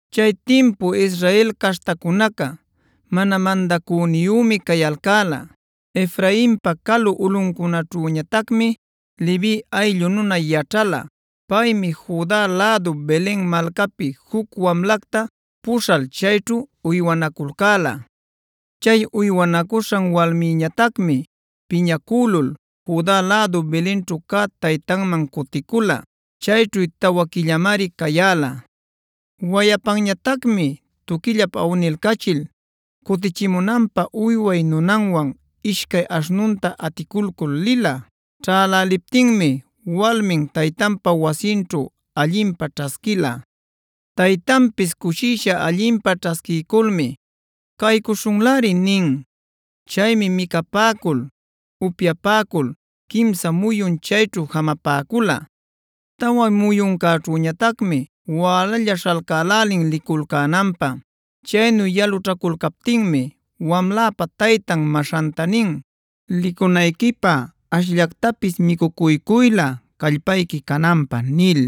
Chay timpu Israel caśhtacunaca mana mandacüniyümi cayalcäla. Efrainpa calu ulꞌuncunaćhüñatacmi Levi ayllu nuna yaćhala. Paymi Juda lädu Belen malcapi juc wamlacta puśhal chayćhu uywanaculcäla. Chay uywanacuśhan walmïñatacmi piñacülula Juda lädu Belenćhu cä taytanman cuticula. Chayćhu tawa quillamari cayäla. Wayapanñatacmi tuquillap awnilcachil cutichimunanpä uyway nunanwan ishcay aśhnunta aticulcul lila. Ćhäläliptinmi walmin taytanpa wasinćhu allinpä ćhasquila. Taytanpis cushisha allinpä ćhasquiyculmi “caycuśhunläri” nin. Chaymi micapäcul, upyapäcul quimsa muyun chayćhu jamapäcula. Tawa muyuncäćhüñatacmi wälalla śhalcälälin liculcänanpä. Chaynu yalućhaculcaptinmi wamläpa taytan maśhanta nin: “Licunayquipä ashllactapis micucuycuylä callpayqui cananpä” nil.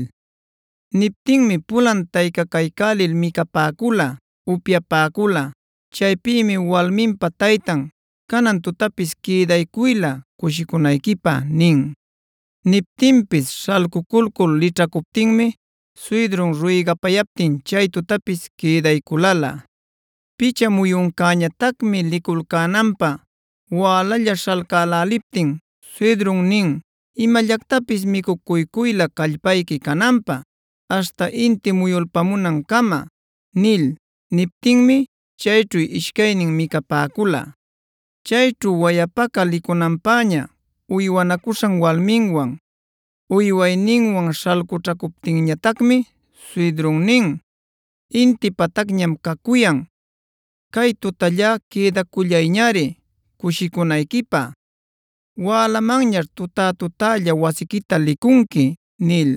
Niptinmi pulan taycacaycälil micapäcula, upyapäcula. Chaypïmi walminpa taytan: “Canan tutapis quïdaycuylä cushicunayquipä” nin. Niptinpis śhalcuculcul lićhacuptinmi suydrun ruygapayaptin chay tutapis quïdayculalä. Picha muyuncäñatacmi liculcänanpä wälalla śhalcäläliptin suydrun nin: “Imallactapis micucuycuylä callpayqui cananpä, aśhta inti muyulpunancama” nil. Niptinmi chayćhu ishcaynin micapäcula. Chayćhu wayapaca licunanpäña uywanacuśhan walminwan, uywayninwan śhalcućhacuptinñatacmi suydrun nin: “Inti patacñam cacuyan; cay tutallá quïdacullayñari cushicunayquipä. Wälamanñaćh tuta-tutälla wasiquita licunqui” nil.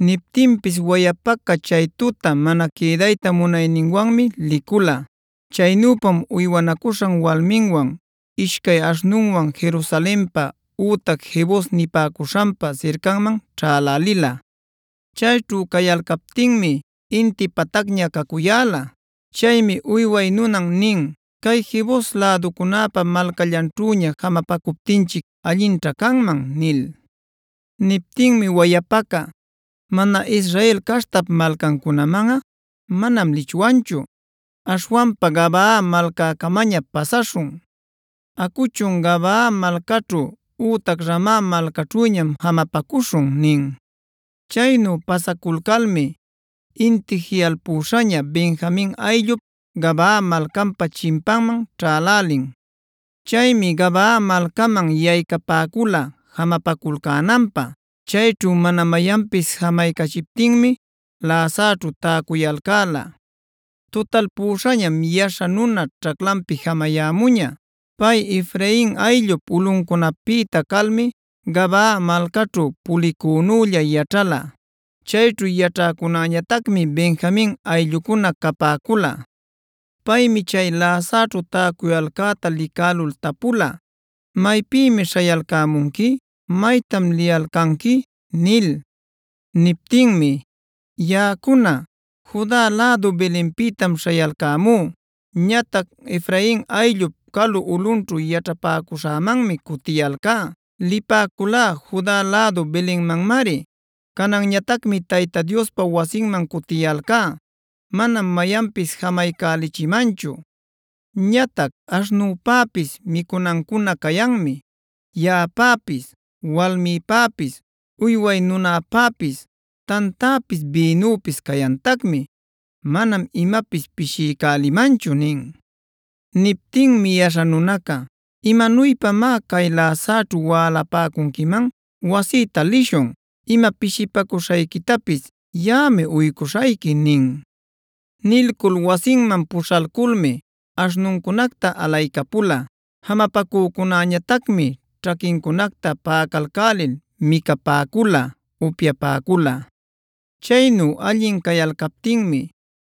Niptinpis wayapaca chay tuta mana quïdayta munayninwanmi licula. Chaynüpam uywanacuśhan walminwan, ishcay aśhnunwan Jerusalenpa ütac Jebus nipäcuśhanpa sircanman ćhälälila. Chayćhu cayalcaptinmi inti patacña cacuyäla. Chaymi uyway nunan nin: “Cay Jebus läducunäpa malcallanćhüña jamapacuptinchic allinćha canman” nil. Niptinmi wayapaca: “Mana Israel caśhtap malcancunamanꞌa manam lichwanchu. Aśhwanpa Gabaa malcäcamaña pasaśhun. Acuchun, Gabaa malcaćhu ütac Rama malcaćhüñam jamapacuśhun” nin. Chaynu pasaculcalmi inti jiꞌalpüśhaña Benjamin ayllup Gabaa malcanpa chimpanman ćhälälin. Chaymi Gabaa malcaman yaycapäcula jamapaculcänanpä. Chayćhu mana mayanpis jamaycachiptinmi läsaćhu täcuyalcäla. Tutalpüśhañam yaśha nuna ćhaclanpi jamayämuña. Pay Efrain ayllup ulꞌuncunapïta calmi Gabaa malcaćhu pulicünülla yaćhala. Chayćhu yaćhäcunäñatacmi Benjamin ayllucuna capäcula. Paymi chay läsaćhu tacuyalcäta licälul tapula: “¿Maypïmi śhayalcämunqui? ¿Maytam liyalcanqui?” nil. Niptinmi: “Yaꞌacuna, Juda lädu Belenpïtam śhayalcämú. Ñatac Efrain ayllup calu ulꞌunćhu yaćhapäcuśhämanmi cutiyalcá. Lipäculá Juda lädu Belenmanmari; cananñatacmi Tayta Diospa wasinmam cutiyalcá. Manam mayanpis jamaycälichimanchu. Ñatac aśhnüpäpis micunancuná cayanmi; yaꞌapäpis, walmïpäpis, uyway nunäpäpis tantäpis bïnüpis cayantacmi. Manam imapis pishiycälimanchu” nin. Niptinmi yaśha nunaca: “¿¡Imanuypamá cay läsaćhu wälapäcunquiman!? Wasïta lishun. Ima pishipacuśhayquitapis yaꞌami uycuśhayqui” nin. Nilcul wasinman puśhaculmi aśhnuncunacta alaycapula. Jamapacücunäñatacmi ćhaquincunacta paꞌacalcälil micapäcula, upyapäcula. Chaynu allin cayalcaptinmi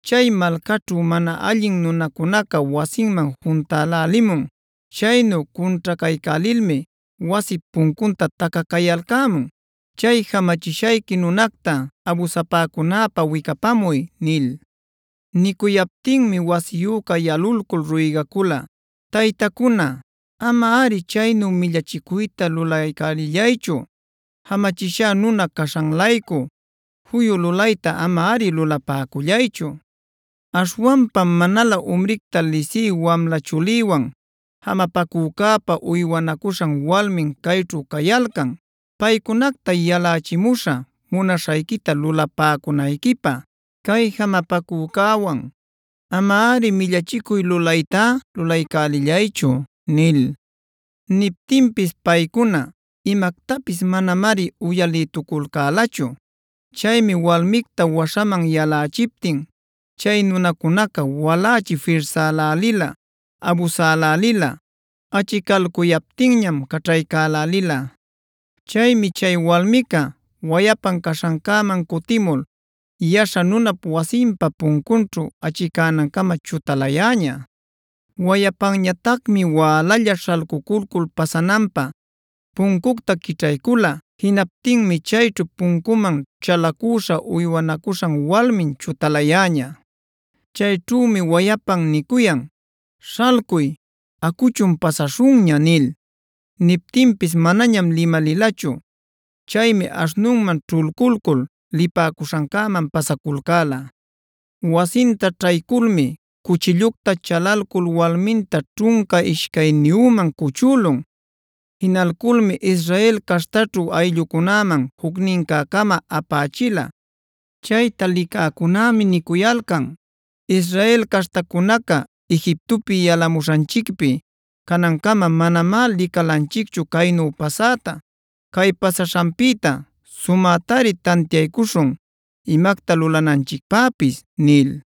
chay malcaćhu mana allin nunacunaca wasiman juntälälimun. Chaynu cunćhacaycälilmi wasip puncunta tacacayalcämun: “¡Chay jamachishayqui nunacta abusapäcunäpä wicapamuy!” nil. Nicuyaptinmi wasiyüca yalulcul ruygacula: “Taytacuna, amari chaynu millachicuytá lulaycälillaychu. Jamachishá nuna caśhan-laycu juyu lulaytá amari lulapäcullaychu. Aśhwanpam manalä umricta lisï wamla chulïwan jamapacücäpa uywanacuśhan walmin cayćhu cayalcan. Paycunacta yalächimuśhä munaśhayquita lulapäcunayquipä. Cay jamapacücäwan amari millachicuy lulaytá lulaycälillaychu” nil. Niptinpis paycuna imactapis manamari uyalïtuculcälachu. Chaymi walmicta waśhaman yalächiptin chay nunacunaca walächi firsälälila, abusälälila. Achicalcuyaptinñam caćhaycälälila. Chaymi chay walmica wayapan caśhancäman cutimul yaśha nunap wasinpa puncunćhu achicänancama chutalayäña. Wayapanñatacmi wälalla śhalcuculcul pasananpä puncucta quićhaycula. Jinaptinmi chayćhu puncuman chalacüśha uywanacuśhan walmin chutalayäña. Chayćhümi wayapan nicuyan: “Śhalcuy, acuchun pasaśhunña” nil. Niptinpis manañam limalilachu. Chaymi aśhnunman ćhulculcul lipäcuśhancäman pasaculcäla. Wasinta ćhayculmi cuchillucta chalalcul walminta ćhunca ishcayniyüman cuchülun. Jinalculmi Israel caśhtaćhu ayllucunäman jucnincä-cama apächila. Chayta licäcunämi nicuyalcan: “Israel caśhtacunaca Egiptopi yalamuśhanchicpi canancama manamá licalanchicchu caynu pasätá. Cay pasaśhanpïta, sumätari tantiaycuśhun imacta lulananchicpäpis” nil.